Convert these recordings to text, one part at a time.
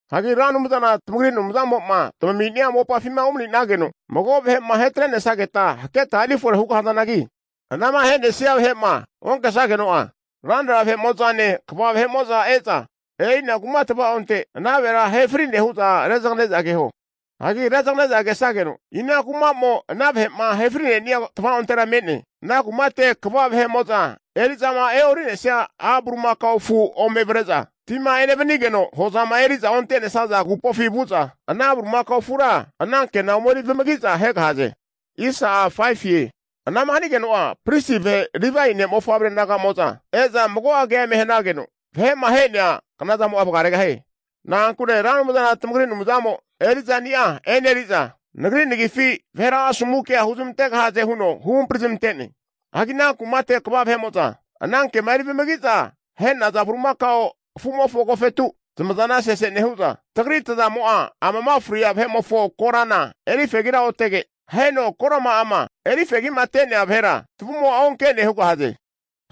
Hagi Ra Anumzana tamagri Anumzamo'ma tamami'nia mopafima umani'nenageno mago vahe'ma ahetre'nesageta haketa erifore hugahazanagi, anama ahe'nesia vahe'ma onkesageno'a, ranra vahe'mo'zane kva vahe'mo'za e'za, e'ina kuma tava'onte ana vahera ahe fri'ne hu'za rezagane'za keho. Hagi rezagane'za kesageno, ina kuma'mo ana vahe'ma ahefrinea tavaontera me'ne, ana kumate kva vahe'mo'za eri'zama e'ori'nesia a' bulimakao afu ome avre'za, tima enevanigeno, hozama eri'za onte'nesaza agupofi vu'za, ana bulimakao afura anankena omeri vamagi'za ahegahaze. Anama hanageno'a pristi vahe Livae ne' mofavre naga'mo'za e'za mago'a kea eme hanageno, vahe'ma ahe'nea knazamo'a vagaregahie. Na'ankure Ra Anumzana tamagri Anumzamo eri'zani'a eneri'za Nagri nagifi vahera asomu kea huzmantegahaze huno huhampri zamante'ne. Hagi ana kumate kva vahe'mo'za anankema eri vamagi'za ahe'naza bulimakao afu'mofo agofetu zmazana sese nehu'za, tagri tazamo'a amama fri'nea vahe'mofo korana erifegira otege, aheno korama'ama erifegi'mate'nea vahera tavumo'a onke'ne hugahaze.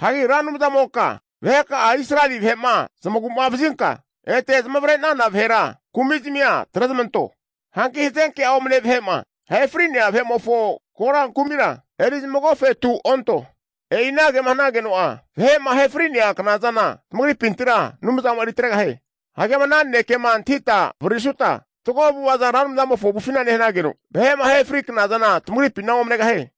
Hagi Ra Anumzamoka vaheka'a Israeli vahe'ma zamagu'mavazinka ete zamavare'nana vahera kumi'zmia atrezmanto. Hanki hazenke'a omne vahe'ma ahe fri'nea vahe'mofo kora kumira eri zamagofetu onto. E'i anagema hanageno'a, vahe'ma ahe fri'nea knazana tamagripintira Anumzamo'a eritregahie. Hagi ama ana nanekema antahita avaririsuta fatgo avu'ava Ra Anumzamofo avufina nehanageno, vahe'ma ahe fri knazana tamagripina omnegahie.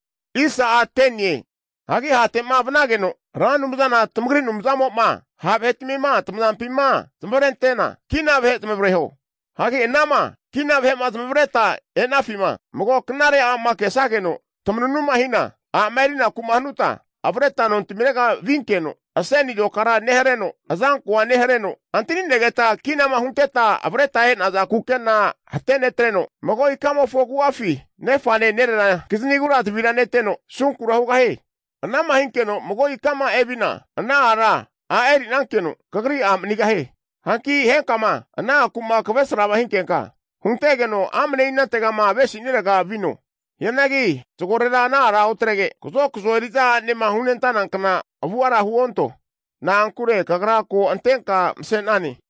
Hagi hate'ma vanageno Ra Anumzana tamagri Anumzamo'ma ha' vahetmima tamazampima zamavarentena, kina vahe zamavareho. Hagi anama kina vahe'ma zamavaretma e'nafima, mago knare a'ma kesageno tamanunuma hina, a'ma erinaku'ma hanutma, avreta nontamirega vinkeno, aseni azokara nehareno, azankoa nehareno, antani'negeta kinama hunteta avreta e'naza kukena hatenetreno, mago ikamofo agu'afi nefane nerera kizinigura zavira neteno asunkura hugahie. Anama hinkeno mago ikama evina, ana ara a' eri'nankeno kagri a' manigahie. Hanki henkama, ana aku'ma kavesra hinkenka, huntegeno amne inantegama avesi'nirega vino. Hianagi zagorera ana ara otrege, kazokazo eri'za a'nema hunentanankna avu'avara huonto. Na'ankure kagra ko antenka mase'nane.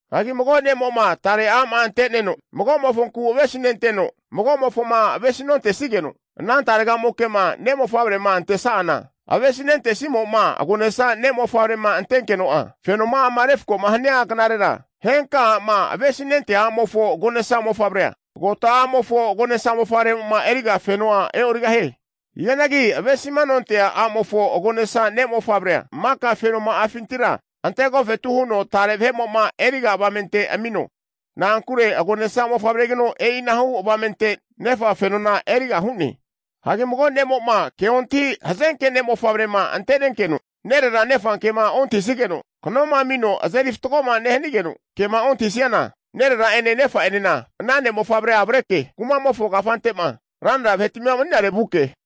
Hagi mago' ne'mo'ma tare a'ma ante'neno, mago'mofonku avesi nenteno, mago'mofoma avesi nontesigeno, ana taregamokema ne' mofavrema antesa'ana, avesi nontesimo'ma agonesa ne' mofavre'ma antenkeno'a, fenoma'ama refko'ma hania knarera, henka a'ma avesimanentea a'mofo agonesa mofavremofona, kota a'mofo agonesa mofavre'mo'ma eriga fenona e'origahie. Hianagi ave'masinontea a'mofo agonesa ne' mofavrea maka fenoma'afintira ante agofetu huno tare vahe'mo'ma eriga avamente amino. Na'ankure agonesa mofavregino, e'inahu avamente nefa fenona eriga hu'ne. Hagi mago ne'mo'ma ke ontahi hazenke ne' mofavrema ante'nenkeno, nerera nefa kema nontahisigeno, kanoma amino azeri fatgoma nehanigeno kema ontahisiana, nerera'ene nefa'enena ana ne' mofavrea avreke kumamofo kafante'ma ranra vahetmima mani'nare vuke,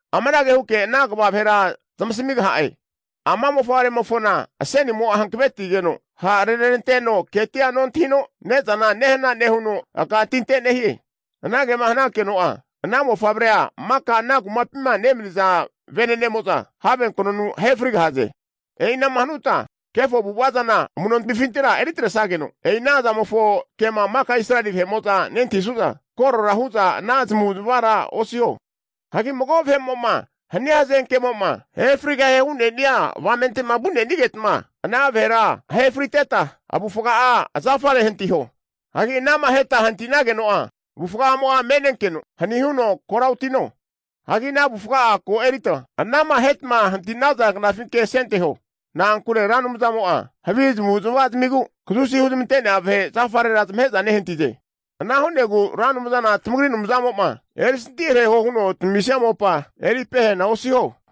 amanage huke ana kva vahera zamasamigaha'e, ama mofavretimofona asenimo'a hankavetigeno ha'reneranteno keti'a nontahino ne'zana nehana nehuno, aka tinte nehie. Anagema hanakeno'a ana mofavrea maka ana kumapima nemaniza venenemo'za have knonu ahe frigahaze. E'inama hanuta kefo avu'ava zana amu'notmifintira eritresageno, e'i ana zamofo kema maka Israeli vahe'mo'za nentahisu'za, korora hu'za ana zmavu'zamavara osiho. Hagi mago vahe'mo'ma hania hazenkemo'ma ahefrigahie hu'ne'ni'a avamente'ma vu'nenigetma, ana vahera ahe friteta, avufga'a zafare hantiho. Hagi anama aheta hanti'nageno'a avufga'amo'a me'nenkeno hani huno kora otino. Hianagi ana avufga'a ko erita anama ahetama hanti'naza knafinke asenteho. Na'ankure Ra Anumzamo'a havi avu'avazamigu kazusi huzmante'nea vahe zafarera zamahe'za nehantize. Ana hu'negu Ra Anumzana tamagri Anumzamo'ma eri santihareho huno'ma tamamisia mopa eri pehana osiho.